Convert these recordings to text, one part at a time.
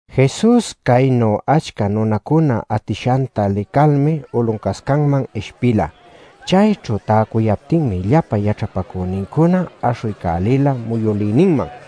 Jesus caynu achca nunacuna atishanta licalmi uluncascaman ishpila. Chayćhu täcuyaptinmi llapa yaćhapacünincuna aśhuycälila muyülïninman.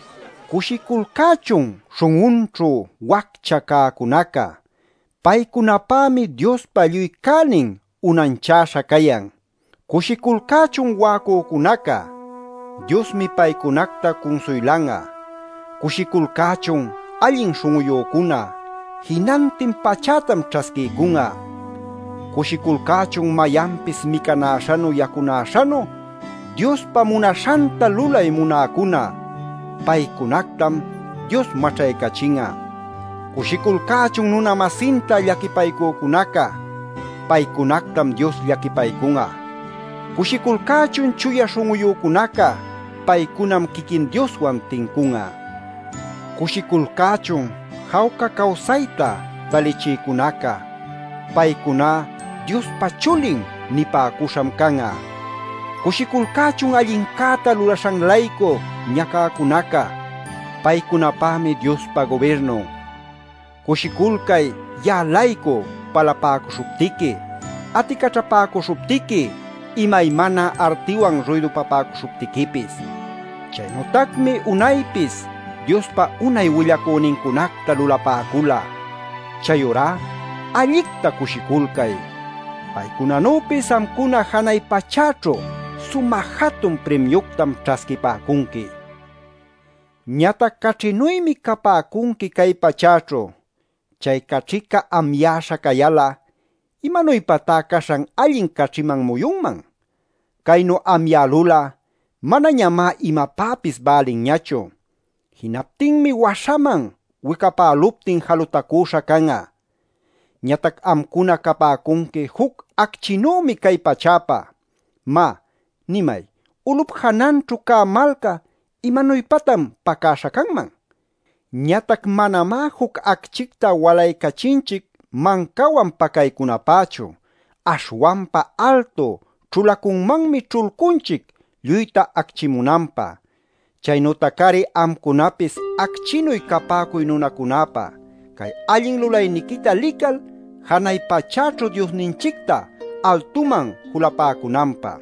“Cushiculcächun śhun'unćhu waccha cäcunaca. Paycunapämi Diospa lluy cänin unanchäśha cayan. Cushiculcächun wa'acücunaca. Diosmi paycunacta cunsuylan'a. Cushiculcächun allin śhun'uyücuna. Jinantin pachätam ćhasquiycun'a. Cushiculcächun mayanpis micanäśhanu yacunäśhanu Diospa munaśhanta lulay munäcuna. Paycunactam Dios maćhaycachin'a. Cushiculcächun nuna-masinta llaquipaycücunaca. Paycunactam Dios llaquipaycun'a. Cushiculcächun chuya śhun'uyücunaca. Paycunam quiquin Dioswan tincun'a. Cushiculcächun jawca cawsayta talichïcunaca. Paycuná ‘Diospa chulin’ nipäcuśham can'a. Cushiculcächun allincäta lulaśhan-laycu ñacäcunaca. Paycunapämi Diospa gubirnun. Cushiculcay ya'a-laycu palapäcuśhuptiqui, aticaćhapäcuśhuptiqui, imaymana artiwan ruydupapäcuśhuptiquipis. Chaynütacmi unaypis Diospa unay willacünincunacta lulapäcula. Chayurá allicta cushiculcay. Paycunanüpis amcuna janay pachäćhu sumä jatun primiuctam ćhasquipäcunqui. “Ñatac caćhinuymi capäcunqui cay pachäćhu. Chay caćhica amyäśha cayal'a, ¿imanuypatá caśhan allin caćhiman muyunman? Caynu amyälul'a manañamá imapäpis bälinñachu. Jinaptinmi waśhaman wicapäluptin, jalutacüśha can'a. “Ñatac amcuna capäcunqui juc acchinümi cay pachäpä. Má, nimay, ulup jananćhu cä malca ¿imanuypatan pacäśha canman? Ñatac manamá juc acchicta walaycachinchic mancawan pacaycunapächu. Aśhwanpa altu ćhulacunmanmi ćhulcunchic lluyta acchimunanpä. Chaynütac-ari amcunapis acchinuy capäcuy nunacunäpä, cay allin lulayniquita lical janay pachäćhu Diosninchicta altuman julapäcunanpä.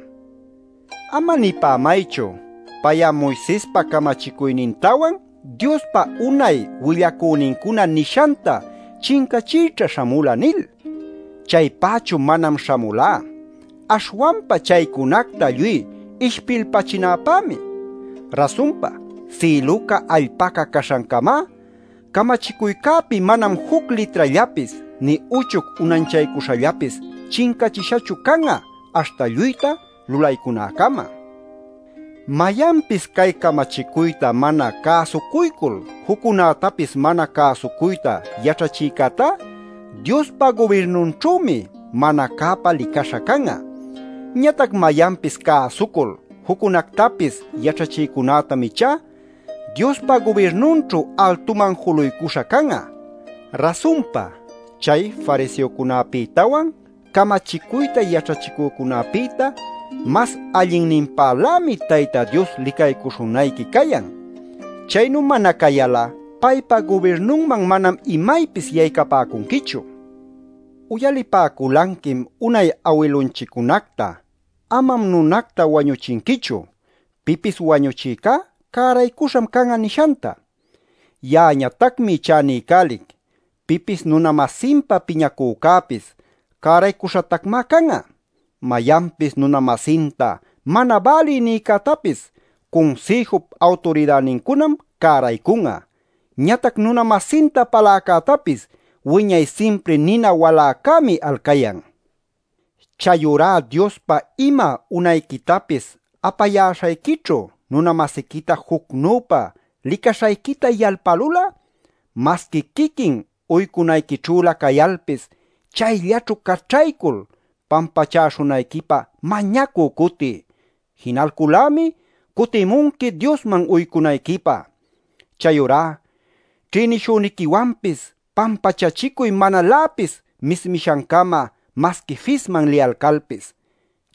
“Ama nipämaychu ‘Pay'a Moisespa camachicuynintawan Diospa unay willacünincuna nishanta chincächïćha śhamula’ nil. Chaypächu manam śhamulá, aśhwanpa chaycunacta lluy ishpilpachinäpämi. Rasunpa, sïluca allpaca caśhancamá, camachicuycäpi manam juc litrallapis, nï uchuc unanchaycuśhallapis chincachishachu can'a aśhta lluyta lulaycunäcama. Mayanpis cay camachicuyta mana cäsucuycul juccunätapis mana cäsucuyta yaćhachïcätá, Diospa gubirnunćhümi mana cäpa licaśha can'a. Ñatac mayanpis cäsucul, juccunactapis yaćhachïcunätam ichá Diospa gubirnunćhu altuman juluycuśha can'a. “Rasunpa, chay fariseocunäpïtawan, camachicuyta yaćhachicücunäpïta, mas allinninpälämi Tayta Dios licaycuśhunayqui cayan. Chaynu mana cayal'a paypa gubirnunman manam imaypis yaycapäcunquichu. “Uyalipäculanquim unay awilunchiccunacta ‘Amam nunacta wañuchinquichu; pipis wañuchïcá cäraycuśham can'a’ nishanta. Ya'añatacmi ichá niycälic, pipis nuna-masinpä piñacücäpis, cäraycuśhatacmá can'a. Mayanpis nuna-masinta ‘mana bälï’ nïcätapis Cunsïjup Awturidänincunam cäraycun'a. Ñatac nuna-masinta paläcätapis wiñay simpri nina waläcämi alcayan. “Chayurá Diospa ima unayquitapis apayäśhayquićhu nuna-masiquita jucnüpa licaśhayquita yalpälul'a, masqui quiquin uycunayquićhülä cayalpis, chayllaćhu caćhaycul pampachaśhunayquipä mañacü cutiy. Jinalcul-lämi cutimunqui Diosman uycunayquipä. “Chayurá ćhïnishüniquiwanpis pampachachicuy manaläpis mismishancama masqui fisman liyalcalpis.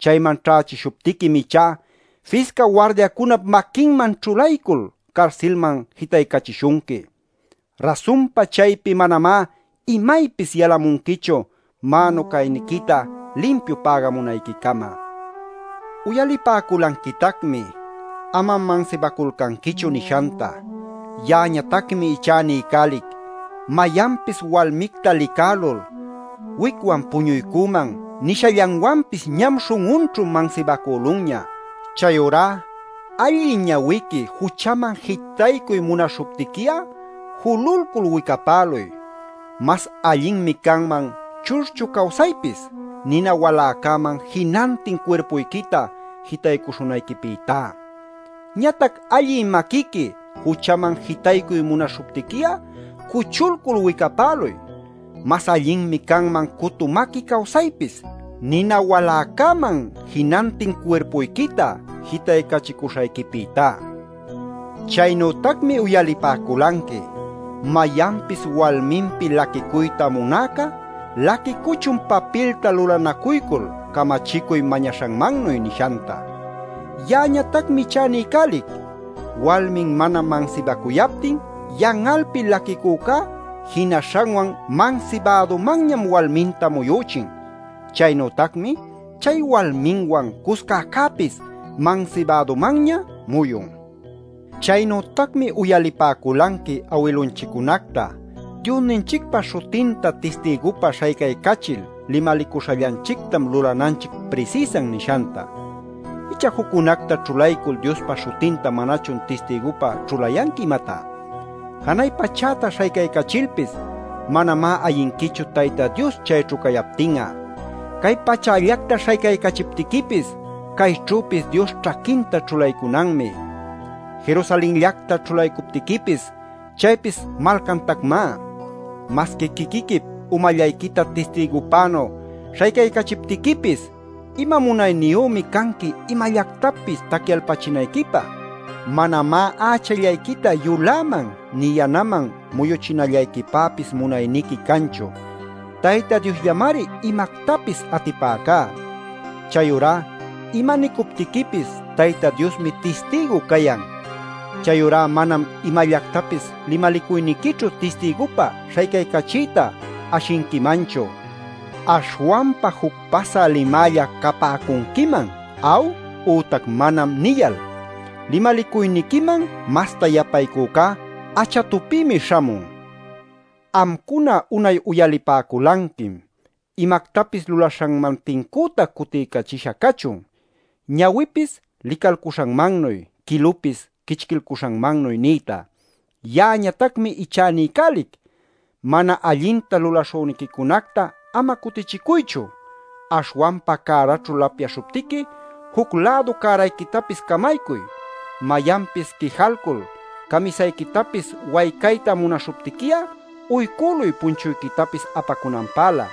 Chayman ćhächishuptiquim ichá fisca wardiacunap maquinman ćhulaycul carsilman jitaycachishunqui. Rasunpa chaypi manamá imaypis yalamunquichu mänu cayniquita limpiu pägamunayquicama. “Uyalipäculanquitacmi ‘Amam mansibaculcanquichu’ nishanta. Ya'añatacmi ichá niycälic, mayanpis walmicta licälul ‘Wicwan puñuycüman’ nishallanwanpis ñam śhun'unćhu mansibacülunña. Chayurá allï ñawiqui juchaman jitaycuy munaśhuptiqui'a, jululcul wicapäluy. Mas allinmi canman churchu cawsaypis, nina waläcäman jinantin cuirpuyquita jitaycuśhunayquipïtá. Ñatac allï maquiqui juchaman jitaycuy munaśhuptiqui'a, cuchulcul wicapäluy. Mas allinmi canman cutu maqui cawsaypis, nina waläcäman jinantin cuirpuyquita jitaycachicuśhayquipïtá. “Chaynütacmi uyalipäculanqui: ‘Mayanpis walminpi laquicuyta munäca, laquicuchun papilta lulanacuycul camachicuy mañaśhanmannuy’ nishanta. Ya'añatacmi ichá niycälic, walmin mana mansibacuyaptin yan'alpi laquicücá, jinaśhanwan mansibädumanñam walminta muyüchin. Chaynütacmi chay walmiwan cuscäcäpis mansibädumanña muyun. “Chaynütacmi uyalipäculanqui awilunchiccunacta: ‘Diosninchicpa śhutinta tistigupä śhaycaycachil limalicuśhallanchictam lulananchic prisïsan’ nishanta. [¿Icha juccunacta ćhulaycul Diospa śhutinta manachun tistigupä ćhulayanqui, imatá?] Janay pachäta śhaycaycachilpis manamá ayinquichu Tayta Dios chayćhu cayaptin'a. Cay pachällacta śhaycaycachiptiquipis cayćhüpis Dios ćhaquinta ćhulaycunanmi. Jerusalenllacta ćhulaycuptiquipis chaypis malcantacmá. Masqui quiquiquip umallayquita tistigupänu śhaycaycachiptiquipis [ima munayniyümi canqui imallactapis tacyalpachinayquipä]; manamá ächallayquita yuläman nï yanaman muyuchinallayquipäpis munayniqui canchu. [Tayta Diosllamari imactapis atipäcá.] Chayurá ima nicuptiquipis Tayta Diosmi tistigu cayan. Chayurá manam imallactapis limalicuyniquićhu tistigupä śhaycaycachiyta ashinquimanchu. Aśhwanpa juc pasä limälla capäcunquiman ‘aw’ ütac ‘manam’ nillal. Limalicuyniquiman masta yapacuycá achatupïmi śhamun. “Amcuna unay uyalipäculanquim: ‘Imactapis lulamäśhanman tincüta cutiycachisha cachun: ñawipis licalcuśhanmannuy, quilupis quichquilcuśhanmannuy’ nïta. Ya'añatacmi ichá niycälic: mana allinta lulaśhüniquicunacta ama cutichicuychu. Aśhwanpa cäraćhu lapyaśhuptiqui, juc-lädu cärayquitapis camaycuy. Mayanpis quijalcul camisayquitapis waycayta munaśhuptiqui'a, uycüluy punchuyquitapis apacunanpälä.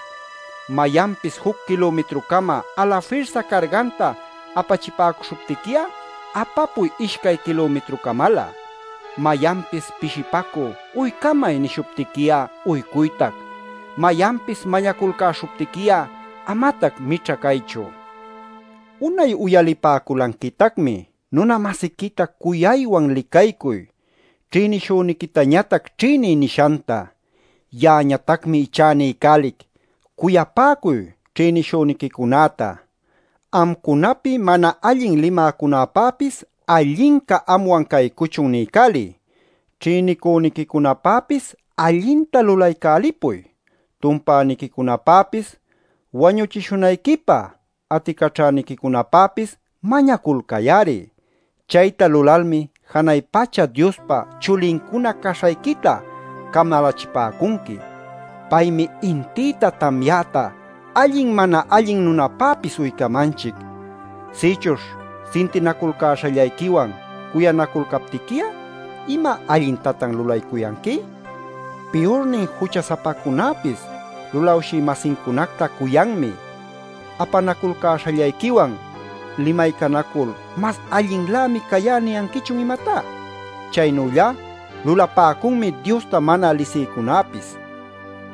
Mayanpis juc kilumitrucama, alafirsa carganta apachipäcuśhuptiqui'a, apapuy ishcay kilumitrucamalä. Mayanpis pishipacü ‘uycamay’ nishuptiqui'a uycuytac. Mayanpis mañaculcäśhuptiqui'a amatac mićha caychu. “Unay uyalipäculanquitacmi: ‘Nuna-masiquita cuyacuywan licaycuy. Ćhïnishüniquitañatac ćhïniy’ nishanta. Ya'añatacmi ichá niycälic: Cuyapäcuy ćhïnishüniquicunäta. Amcunapi mana allin limäcunäpäpis ‘Allinca anwan caycuchun’ niycäliy. Ćhïnicüniquicunapäpis allinta lulaycälipuy. Tumpäniquicunapäpis wañuchishunayquipä aticaćhäniquicunapäpis mañaculcay-ari. Chayta lulalmi janay pacha Diospa chulincuna caśhayquita camalächipäcunqui. Paymi intïta tamyäta allin mana allin nunapäpis uycamanchic. Sïchuśh sintinaculcäśhallayquiwan cuyanaculcaptiqui'a ¿ima allintatan lulaycuyanqui? Piyurnin jucha-sapacunäpis lulawshï-masincunacta cuyanmi. Apanaculcäśhallayquiwan limaycanacul ‘mas allinninlämi cayá’ ¿niyanquichun imatá? Chaynüllá lulapäcunmi Diosta mana lisïcunäpis.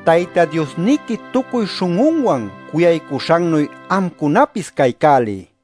Tayta Diosniqui tucuy śhun'unwan cuyaycuśhannuy amcunapis caycäliy.